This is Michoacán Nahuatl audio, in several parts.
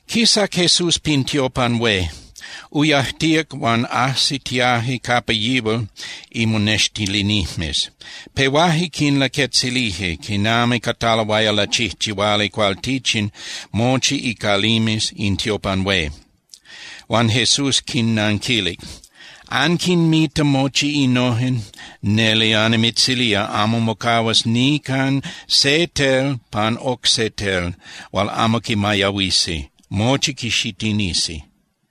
Quisac Jesús pin tiopan hué, uyajtíac huan ajsitiaje capa yihual imonextilinijmes. Pehuaje quilaquetzilije quinami cataloaya lachijchihuali cualtichin mochi icalimes in tiopan hué. Huan Jesús quinnanquilic: —¿Anquinmita mochi innojen? Neli annimitzilía, amo mocahuas nican se tel pan oc se tel hual amo quimayahuisi, mochi quixitinisi.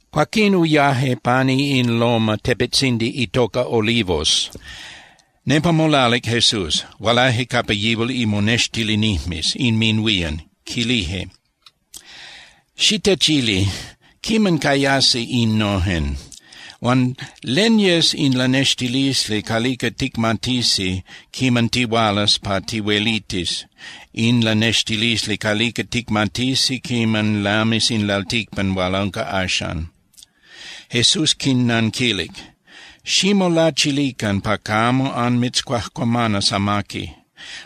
Cuaquín uyaje pani in loma (tepetzindi) itoca Olivos. Nepa molalic Jesús, hualaje capa yihual imonextilinijmes inminhuían, quilije: —Xitechili, ¿quiman cayasi innojen? Huan ¿len yes in lanextilisli calica ticmatisi quiman tihualas pa tihuelitis, in lanextilisli calica ticmatisi quiman lamis in lalticpan hual unca axan? Jesús quinnanquilic: —Ximolachilican pa camo anmitzcuajcuamanas amaqui.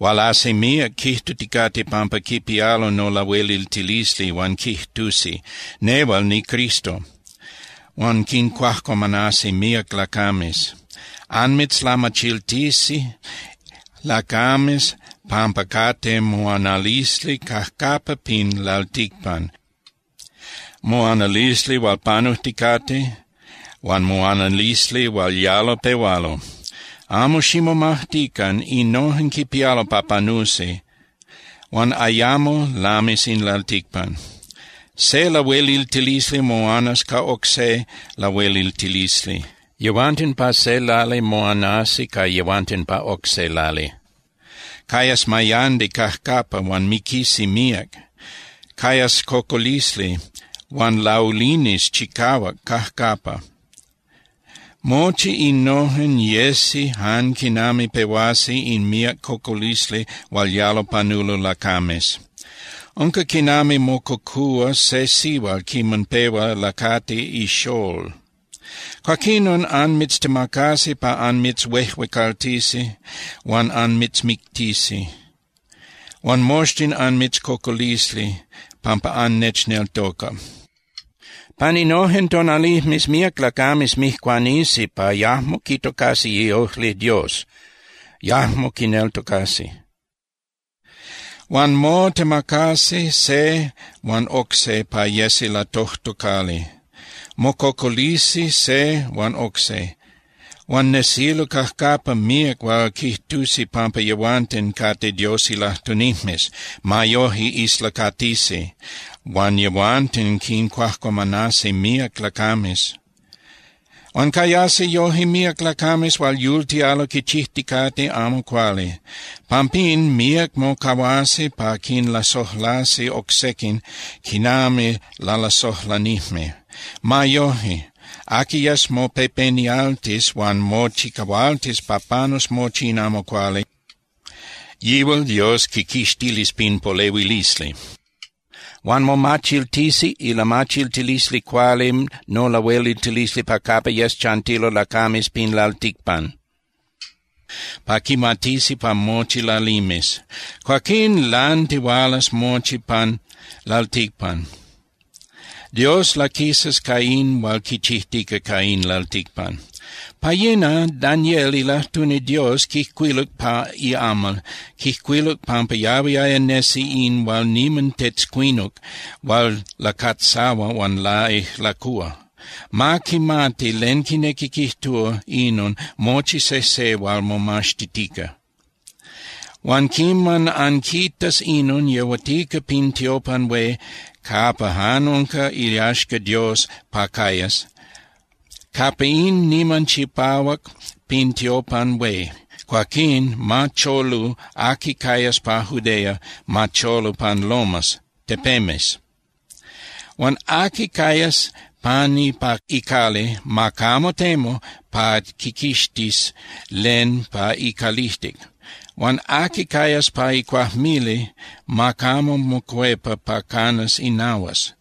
Hualasi míac quijtuticate pampa quipialo nolahueliltilisli, huan quijtusi: “Nehual niCristo”, huan quincuajcuamanasi míac lacames. Anmitzlamachiltisi lacames pampa cate moanalisli cajcapa pin lalticpan, moanalisli hual panujticate huan moanalisli hual yalo pehualo. Amo ximomajtican, innojen quipialo pa panusi huan ayamo lamis in lalticpan. Se lahueliltilisli moanas ca oc se lahueliltilisli. Yehuanten pa se lali moanasi ca yehuanten pa oc se lali. Cayas mayandi cajcapa huan miquisi míac. Cayas cocolisli, huan laulinis chicahuac cajcapa. Mochi innojen yesi jan quinami pehuasi in miác cocolisli hual yalo panulo lacames. Unca quinami mococúa se sihual quiman pehua lacati ixól. ’Cuaquinon anmitztemacasi pa anmitzhuejuecaltisi huan anmitzmictisi. Huan moxtin anmitzcocolisi pampa annechneltoca. Pan innojen tonalijmes míac lacames mijcuanisi pa yajmo quitocasi iojli Dios, yajmo quineltocasi. Huan motemacasi se huan oc se pa yesi latojtocali. Mococolisi se huan oc se. Huan nesilo cajcapa míac hual quijtusi pampa yehuanten cate Dios ilajtunijmes. Ma yoje, islacatisi, huan yehuanten quincuajcuamanasi míac lacames. Huan cayasi yoje míac lacames hual yultialo quichijticate amo cuali. Pampín, míac mocahuasi pa quinlasojlasi oc sequin quinami lalasojlanijme. Ma yoje, aqui yes mopepenialtis huan mochicahualtis pa panus mochi in amo cuali, yihual Dios quiquixtilis pin polehuilisli. Huan momachiltisi ilamachiltilisli cuali nolahueliltilisli pa capa yes chantilo lacames pin lalticpan, pa quimatisi pa mochi lalimes. Cuaquín lantihualas mochi pan lalticpan. Dios laquisas ca in hual quichijtica ca in lalticpan. ’Pa yina, Daniel ilajtuni Dios quijcuiluc pa iamal, quijcuiluc pampa yahuiaya nesi in hual niman tetzcuinuc hual lacatzahua huan laijlacúa. (Ma quimati len quinequi quijtúa inon mochi sejse hual momaxtitica.) Huan quiman anquitas inon yehuatica pin tiopan hué capa jan unca iyaxca Dios pa cayas, capa in niman chipahuac pin tiopan hué, cuaquín ma cholu aqui cayas pa Judea, ma cholu pan lomas (tepemes). Huan aqui cayas pani pa icali, ma camo temu pa quiquixtis len pa icalijtic. Huan aqui cayas pa icuajmili, ma camo mocuepa pa canas inahuas.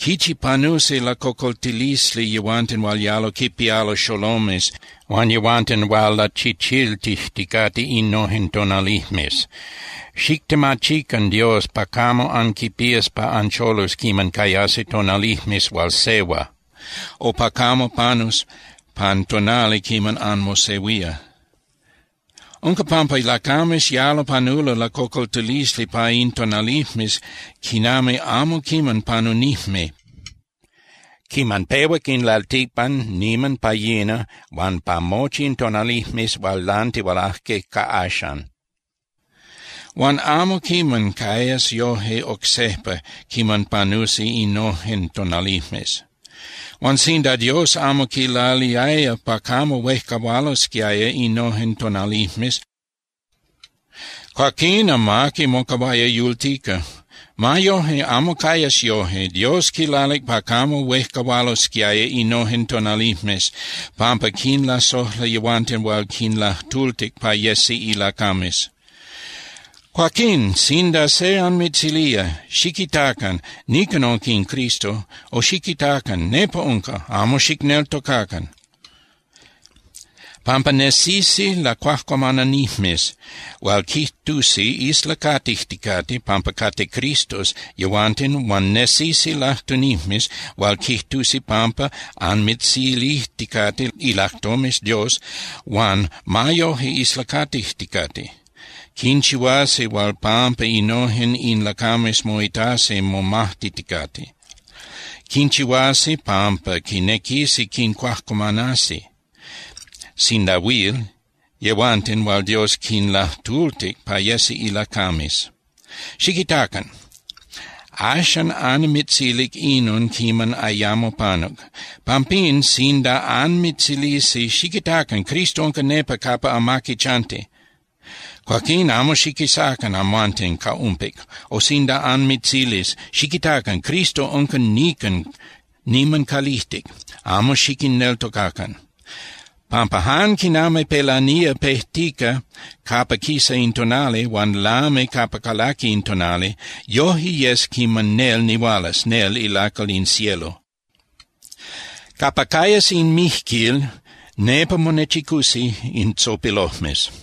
¡Quichi panusi lacocoltilisli yehuanten hual yalo quipialo xolomes huan yehuanten hual lachichiltijticate innojen tonalijmes! Xictemachican Dios pa camo anquipías pa ancholus quiman cayasi tonalijmes hual sehua, o pa camo panus pan tonali quiman anmosehuía. Unca pampa lacames yalo panulo lacocoltilisli pa in tonalijmes quinami amo quiman panunijme quiman pehuac in lalticpan niman pa yina huan pa mochi in tonalijmes hual lantihualaje ca axan. Huan amo quiman cayas yoje oc sejpa quiman panusi innojen tonalijmes. Huan sinda Dios amo quilaliaya pa camo huejcahualosquiaya innojen tonalijmes, cuaquín amaqui mocahuaya yultica. Ma yoje, amo cayas yoje. Dios quilalic pa camo huejcahualosquiaya innojen tonalijmes pampa quinlasojla yehuanten hual quinlajtultic pa yesi ilacames. ’Cuaquín, sinda se anmitzilía: “Xiquitacan, nican unca in Cristo”, o “Xiquitacan, nepa unca”, amo xicneltocacan. Pampa nesisi lacuajcuamananijmes hual quijtusi islacatijticate pampa cate cristos yehuanten huan nesisi lajtunijmes hual quijtusi pampa anmitzilijticate ilajtomes Dios, huan ma yoje islacatijticate. Quinchihuasi hual pampa innojen in lacames moitasi momajtiticate. Quinchihuasi pampa quinequisi quincuajcuamanasi, sinda huil, yehuanten hual Dios quinlajtultic pa yesi ilacames. Xiquitacan. Axan annimitzilic inon quiman ayamo panuc. Pampín sinda anmitzilisi: “Xiquitacan. Cristo unca nepa capa amaqui chanti”, cuaquín amo xiquisacan amhuanten ca umpic. O sinda anmitzilis: “Xiquitacan. Cristo unca nican niman calijtic”, amo xiquinneltocacan. Pampa jan quinami pelanía pejtica capa quisa in tonali huan lami capa calaqui in tonali, yoje yes quiman nel nihualas, nel ilacal in cielo. Capa cayas in mijquil, nepa monechicusi in tzopilojmes.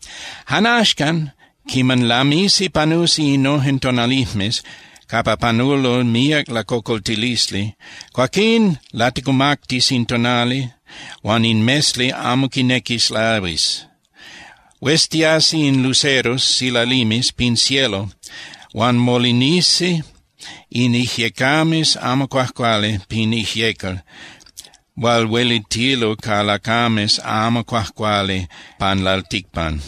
’Jan axcan quiman lamisi panusi innojen tonalijmes capa panulo míac lacocoltilisli, cuaquín laticumactis in tonali huan in mesli amo quinequis lahuis. Hueztiasi in luceros (silalimes) pin cielo huan molinisi in ijyecames amo cuajcuali pin ijyecal hual huelitilo ca lacames amo cuajcuali pan lalticpan,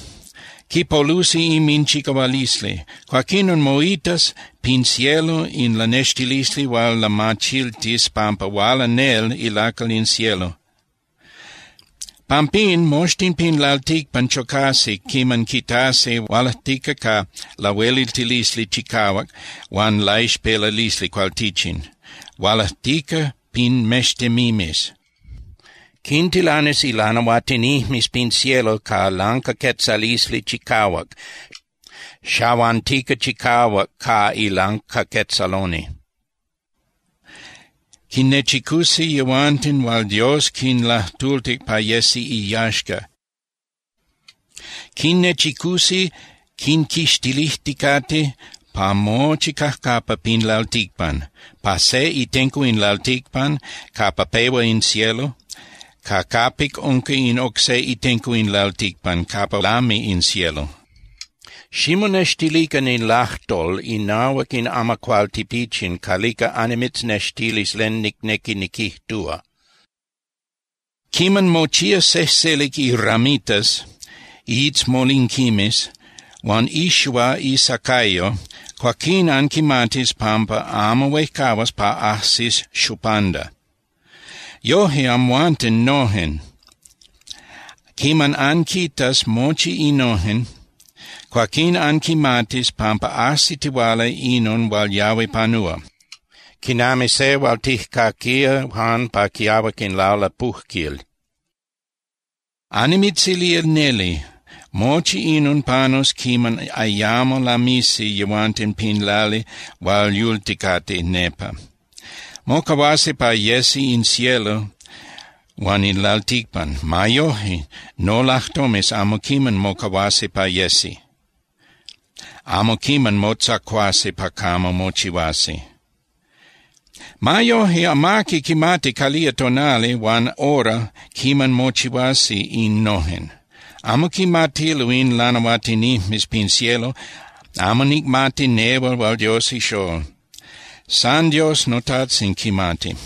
quipolusi inminchicahualisli. Cuaquinon moitas pin cielo in lanextilisli hual lamachiltis pampa huala nel ilacal in cielo. Pampín moxtin pin lalticpan chocasi quiman quitasi hualajtica ca lahueliltilisli chicahuac huan laixpelalisli cualtichin, hualajtica pin mextemimes. Quintilanis ilanahuatinijmes pin cielo ca lancaquetzalisli chicahuac, xahuantica chicahuac ca ilancaquetzaloni. Quinnechicusi yehuanten hual Dios quinlajtultic pa yesi iyaxca. Quinnechicusi quinquixtilijticate pa mochi cajcapa pin lalticpan, pa se itenco in lalticpan capa pehua in cielo ca capic unca in oc se itenco in lalticpan capa lami in cielo. ’Ximonextilican in lajtol inahuac in amacuál tipichin calica annimitznextilis len nicnequi niquijtúa: Quiman mochía sejselic iramitas (iitzmolinquimes) huan ixua isacayo, cuaquín anquimatis pampa amo huejcahuas pa ajsis xupanda. Yoje, amhuanten noje quiman anquitas mochi innojen, cuaquín anquimatis pampa ajsitihuala inon hual yahui panúa, quinami se hual tijcaquía jan pa quiahuac in lalapujquil. Annimitzilía neli, mochi inon panus quiman ayamo lamisi yehuanten pin lali hual yulticate nepa. Mocahuasi pa yesi in cielo huan in lalticpan. Ma yoje, nolajtomes amo quiman mocahuasi pa yesi, amo quiman motzacuasi pa camo mochihuasi. ’Ma yoje, amaqui quimati calía tonali huan hora quiman mochihuasi innojen. Amo quimatilo in lanahuatinijmes pin cielo, amo nicmati nehual hual Dios ixól. San Dios noTajtzin quimati.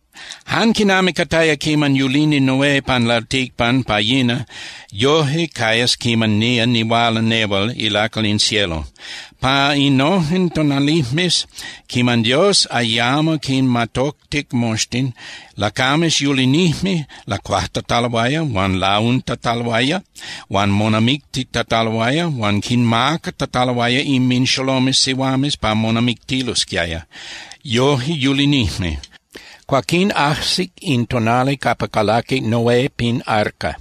’Jan quinami cataya quiman yulini Noé pan lalticpan pa yina, yoje cayas quiman nía nihuala nehual ilacal in cielo. Pa innojen tonalijmes quiman Dios ayamo quinmatoctic moxtin, lacames yulinijme lacuajtataloaya huan launtataloaya huan monamictitataloaya huan quinmacatataloaya inminxolomes sihuames pa monamictilosquiaya, yoje yulinijme. Cuaquín ajsic in tonali capa calaquic Noé pin arca.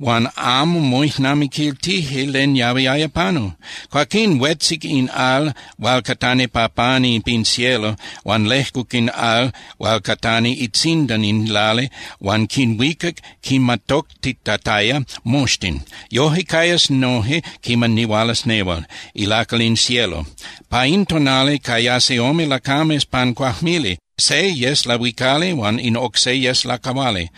Huan amo moijnamiquiltije len yahuiaya panu. Cuaquín huetzic in al hual catani pa pani pin cielo huan lejcuc in al hual catani itzindan in lali huan quinhuicac quinmatoctitataya moxtin. Yoje cayas noje quiman nihualas nehual, ilacal in cielo. Pa in tonali, cayasi ome lacames pan cuajmili, se yes lahuicali huan in oc se yes lacahuali.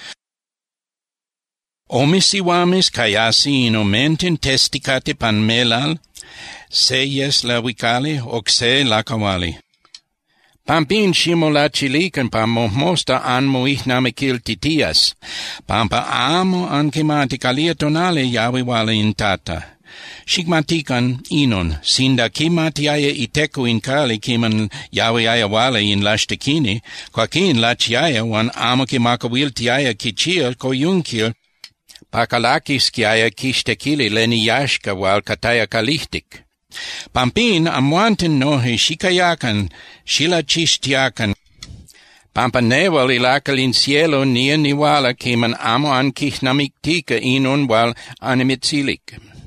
Ome sihuames cayasi in omenten testicate pan melal, se yes lahuicali, oc se lacahuali. ’Pampín, ximolachilican pa mojmosta anmoijnamiquiltitías, pampa amo anquimati calía tonali yahui huala in Tata. Xicmatican inon: Sinda quimatiaya iteco in cali quiman yahuiaya huala in laxtequini, cuaquín lachiaya huan amo quimacahuiltiaya quichía coyunquil pa calaquisquiaya quixtequili len iyaxca hual cataya calijtic. Pampín, amhuanten noje xicayacan xilachixtiacan, pampa nehual ilacal in cielo nía nihuala quiman amo anquijnamictica inon hual annimitzilic.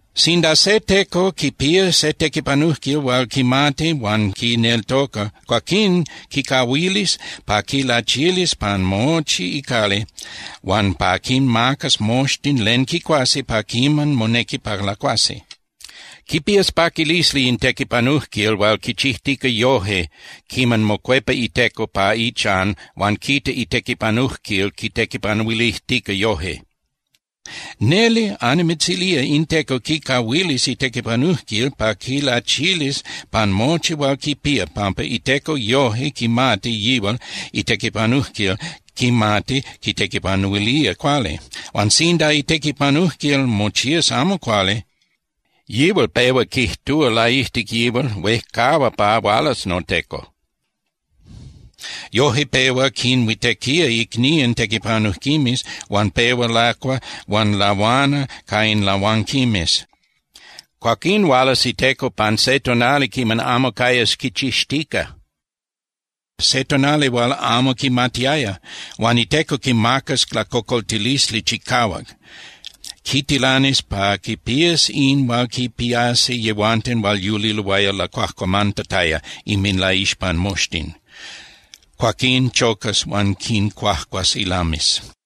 ’Sinda se teco quipía se tequipanujquil hual quimati huan quineltoca, cuaquín quicahuilis pa quilachilis pan mochi icali huan pa quinmacas moxtin len quicuasi pa quiman monequi pa lacuasi. Quipías paquilisli in tequipanujquil hual quichijtica yoje quiman mocuepa iteco pa ichan huan quita itequipanujquil quitequipanuilijtica yoje. Neli annimitzilía in teco quicahuilis itequipanujquil pa quilachilis pan mochi hual quipía pampa iteco yoje quimati yihual itequipanujquil quimati quitequipanuilía cuali. Huan sinda itequipanujquil mochías amo cuali, yihual pehua quijtúa laijtic yihual: “Huejcahua pa hualas noteco.” Yoje pehua quinhuitequía icnían tequipanujquimes huan pehua lacua huan lahuana ca in lahuanquimes. Cuaquín hualas iteco pan se tonali quiman amo cayas quichixtica, se tonali hual amo quimatiaya. Huan iteco quimacas lacocoltilisli chicahuac. Quitilanis pa quipías in hual quipiasi yehuanten hual yuliloaya lacuajcuamantataya inminlaixpan moxtin. Cuaquín chocas huan quincuajcuas ilames.